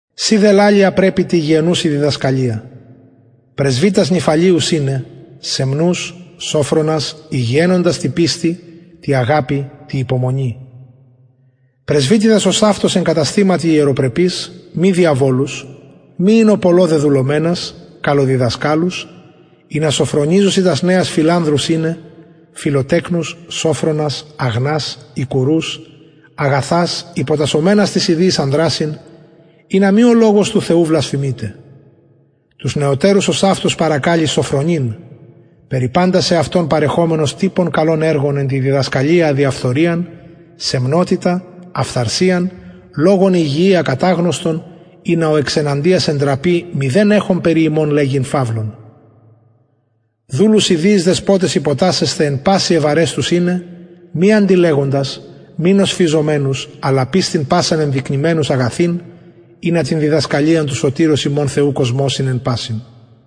συ δε λαλει α πρεπει τη υγιαινουση διδασκαλια πρεσβυτας νηφαλεους ειναι σεμνους σωφρονας υγιαινοντας τη πιστει τη αγαπη τη υπομονη πρεσβυτιδας ωσαυτως εν καταστηματι ιεροπρεπεις μη διαβολους μη οινω πολλω δεδουλωμενας καλοδιδασκαλους ινα σωφρονιζωσιν τας νεας φιλανδρους ειναι φιλοτεκνους σωφρονας αγνας οικουρους αγαθας υποτασσομενας τοις ιδιοις ανδρασιν ινα μη ο λογος του θεου βλασφημηται τους νεωτερους ωσαυτως παρακαλει σωφρονειν περι παντα σεαυτον παρεχομενος τυπον καλων εργων εν τη διδασκαλια αδιαφθοριαν σεμνοτητα αφθαρσιαν λογον υγιη ακαταγνωστον ινα ο εξ εναντιας εντραπη μηδεν εχων περι ημων λεγειν φαυλον δουλους ιδιοις δεσποταις υποτασσεσθαι εν πασιν ευαρεστους ειναι μη αντιλεγοντας μη νοσφιζομενους αλλα πιστιν πασαν ενδεικνυμενους αγαθην ινα την διδασκαλιαν του σωτηρος ημων θεου κοσμωσιν εν πασιν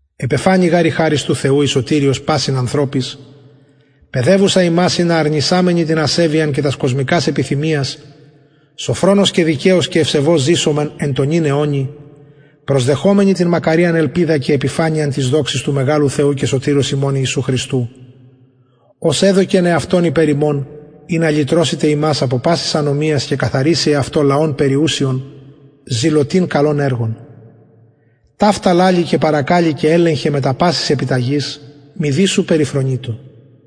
επεφανη γαρ η χαρις του θεου η σωτηριος πασιν ανθρωποις παιδευουσα ημας ινα αρνησαμενοι την ασεβειαν και τας κοσμικας επιθυμιας σωφρονως και δικαιως και ευσεβως ζησωμεν εν τω νυν αιωνι προσδεχομενοι την μακαριαν ελπιδα και επιφανειαν της δοξης του μεγαλου θεου και σωτηρος ημων ιησου χριστου ος εδωκεν εαυτον υπερ ημων ινα λυτρωσηται ημας απο πασης ανομιας και καθαριση εαυτω λαον περιουσιον ζηλωτην καλων εργων ταυτα λαλει και παρακαλει και ελεγχε μετα πασης επιταγης μηδεις σου περιφρονειτω